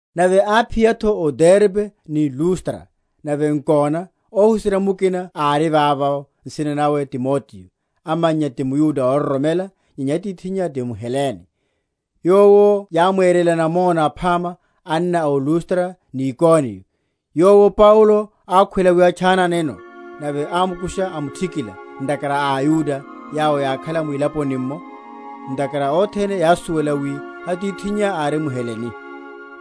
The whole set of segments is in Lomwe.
Nave áphiya’tho o Derbe ni Lustra; nave nkona, óhuserya mukina ári vavo, nsina nawe Timoteo, amannya ti mYuda óroromela; nyenya atithinnya ti mHelene. Yowo yámwerela namona aphama anna o Lustra ni Ikoniyo. Yowo Paulo ákhwela wi atchananeno, nave ámukusha, amuthikila, ntakhara a aYuda yawo yákhala mwilaponi’mmo; ntakhara othene yásuwela wi atithinnya ári mHelene.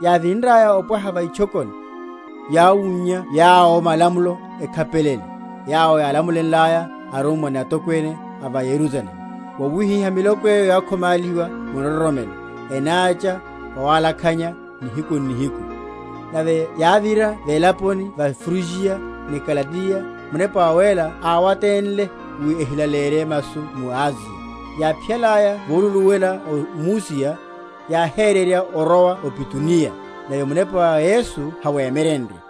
Yávinraya opwaha va itchokoni, yáwunnya yawo malamulo ekhapelele, yawo yálamulenlaya arummwa ni atokwene a va Yerusalemu. Wawihiha miloko eyo yákhomálihiwa mu nroromelo, enácha vowalakhanya nihiku n’nihiku. Nave yávira velaponi ya Frugiya ni Galatiya, Munepa Wawéla áwatenle wi ehilaleyerye masu mu Asiya; yáphiyalaya voluluwela o Musiya, yáhererya orowa o Bituniya; nave Munepa wa Yesu háwemye?-?renrye;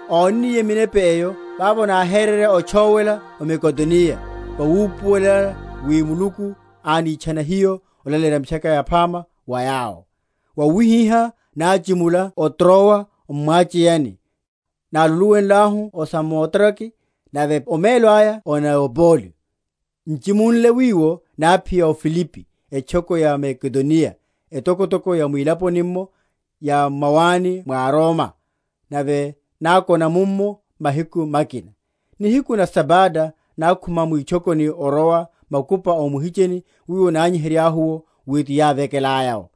Ónniye minepa eyo, vavo náhererya otchówela o Makedoniya, vawupuwelela wi Muluku ánitchana hiyo olaleyerya Mitchaka Yaphama wa yawo. Wawihiha náchimula o Trowa m’mwacheyani, náluluwenlahu o Samotrake, nave omelo aya o Neapoli; n’chimunle wiwo náphiya o Filipi, etchoko ya Makedoniya, etokotoko ya mwilaponi’mmo, ya m’mawani mwa Roma; nave nákona mummo mahiku makina. Nihiku na Sabata nákhuma mwitchokoni orowa makupa o muhicheni, wiwo nányihenryahu’wo wi tanavekelaya’wo;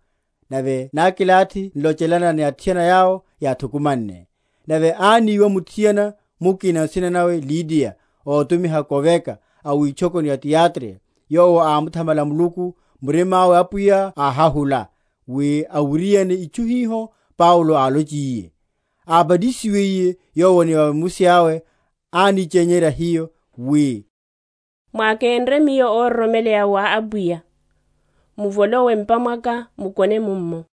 nave nákilathi n’lochelana ni athiana yawo yáthukumanne. Nave áníwa muthiana mukina nsina nawe Lidiya, ótumiha koveka, a witchokoni ya Tiyatira, yowo ámuthamala Muluku; murima’we Apwiya áhahula, wi awiriane itchu hiho Paulo álonchiye. Ábatisiwiye yowo ni a vemusi awe ánichenyerya hiyo, wi, Mwákenre miyo óroromeleya wa Apwiya, muvolowe m’pa mwaka, mukone mummo.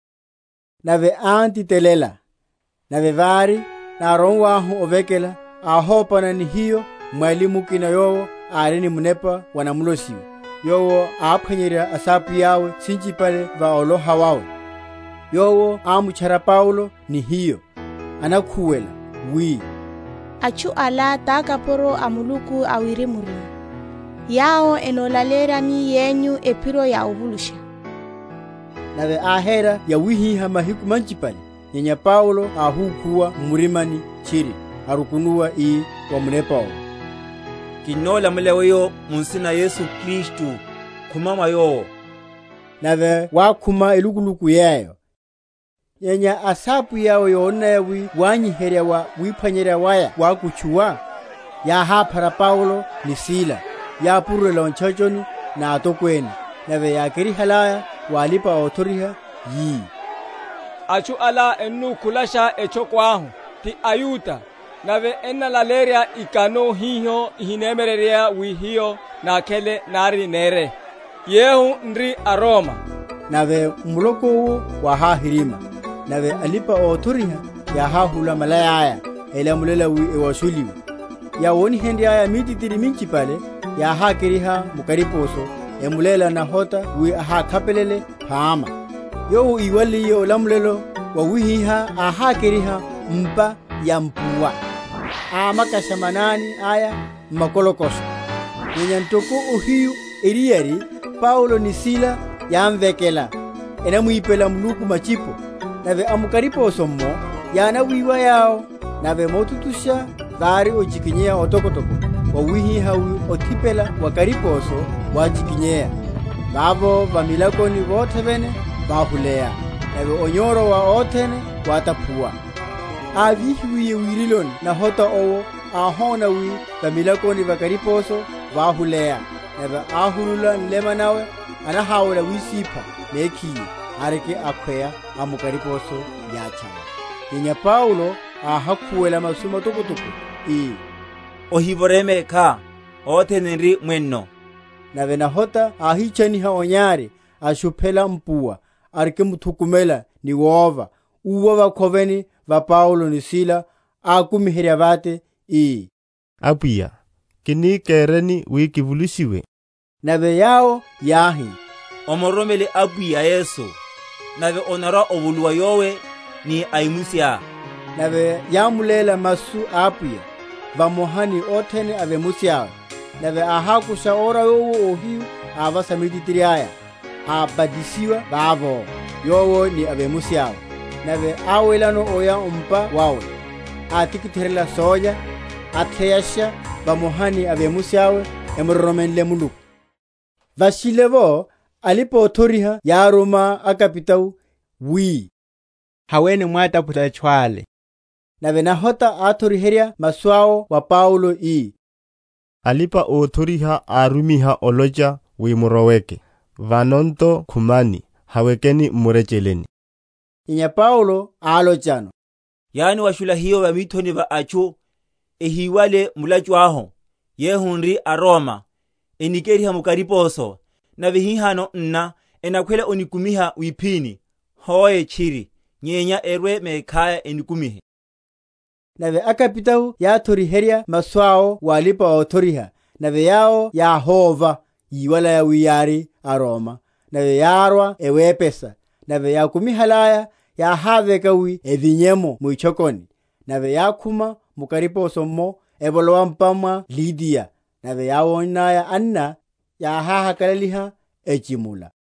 Nave án’titelela. Nave vári, nárowahu ovekela, áhopana ni hiyo mwali mukina yowo ári ni munepa wa namulosiwe, yowo áphwanyerya asapwiya’we sinchipale va oloha wawe. Yowo ámutchara Paulo ni hiyo, anakhuwela, wi, Atchu ala takapuro a Muluku awirimurimu, yawo enolaleyeryani yenyu ephiro ya ovulushiwa. Nave áhéra yawihiha mahiku manchipale. Nyenya Paulo áhúkhuwa m’murimani tchiri, arukunuwa, ii wa munepa owo, Kinnolamulela weyo mu nsina na Yesu Kristu, khuma mwa yowo. Nave wákhuma elukuluku yeyo. Nyenya asapwiya’we yónnaya wi wanyiherya wa wiphwanyerya waya wákutchuwa, yáhaphara Paulo ni Sila, yapurulela o ntchachoni na atokwene, nave yákerihalaya wa alipa‐othoriha, yi, Atchu ala ennu?-?khulasha etchoko ahu, ti aYuda, nave ennalaleyerya ikano hiho ihinemyereryeya wi hiyo nákhele, nari nére, yehu n’ri aRoma. Nave muloko’wo wáháhirimya; nave alipa‐othoriha yáháhula malaya’ya; elamulela wi ewashuliwe. Yáwonihenryaya mítitiri minchipale, yáhákeriha mu kariposo, emuléla nahota wi ahákhapelele phama. Yowo íwaliye olamulela wawihiha áhákeriha m’mpa ya mpuwa, amakasha manani aya m’makolokosho. Nyenya ntoko ohiyu eriyari, Paulo ni Sila yámvekela, enamwipela Muluku matchipo, nave a mu kariposo’mmo yánawiwa yawo; nave motutusha vári ochikinyeya otokotoko, wawihiha wi othipela wa kariposo wáchikinyeya: vavo va milakoni vothe vene váhuleya; nave onyoro wa othene wátaphuwa. Ávihiwiye wiriloni nahota owo, áhona wi va milakoni va kariposo váhuleya, nave áhulula nlema nawe, anaháwela wisipha mekhiye, ariki akhweya amukariposo yáhatchawa. Nyenya Paulo áhakhuwela masu matokotoko, ii, Ohívoreye mekhá: othene n’ri mwenno. Nave nahota áhitchaniha onyari, ashuphela mpuwa, arikimthukumela ni wova, úwa vakhoveni va Paulo ni Sila, ákumiherya vate, ii, Apwiya, kini kereni wi kivulushiwe? Nave yawo yáhi, Omuroromele Apwiya Yesu, nave onarwa‐ovuluwa, yowe ni a vemusiá. Nave yámuléla masu a Apwiya, vamoha ni othene a vemusi awe. Nave áhákusha ora yowo ohiyu, avasa mítitiri aya; abatisiwa vavo, yowo ni a vemusi awe. Nave áwelano oya o’mpa wawe, átikitheryela sólya, atheyasha, vamoha ni a vemusi awe, emuroromenle Muluku. Vashile’vo, alipa‐othoriha yáruma akapitao, wi, Haweni mwátaphule atchu ale. Nave nahota áthoriherya masu awo wa Paulo, ii, Alipa‐othoriha arumiha olocha wi muroweke; vano nto khumani, hawekeni m’murecheleni. Nyenya Paulo álochano, Yániwashula hiyo va mithoni va atchu, ehíwale mulachu ahu, yehu n’ri aRoma, enikeriha mu kariposo; nave hihano nná ennakhwela onikumiha wiphini? Hoe, tchiri, nyenya erwe mekhaya enikumihe. Nave akapitao yáthoriherya masu awo wa alipa‐othoriha; nave yawo yáhóva, yíwalaya wi yári aRoma. Nave yárwa ewepesa; nave yákumihalaya, yáháveka wi evinye’mo mwitchokoni. Nave yákhuma mu kariposo’mmo, evolowa m’mpa mwa Lidiya: nave yáwonnaya anna, yáháhakalaliha, echimula.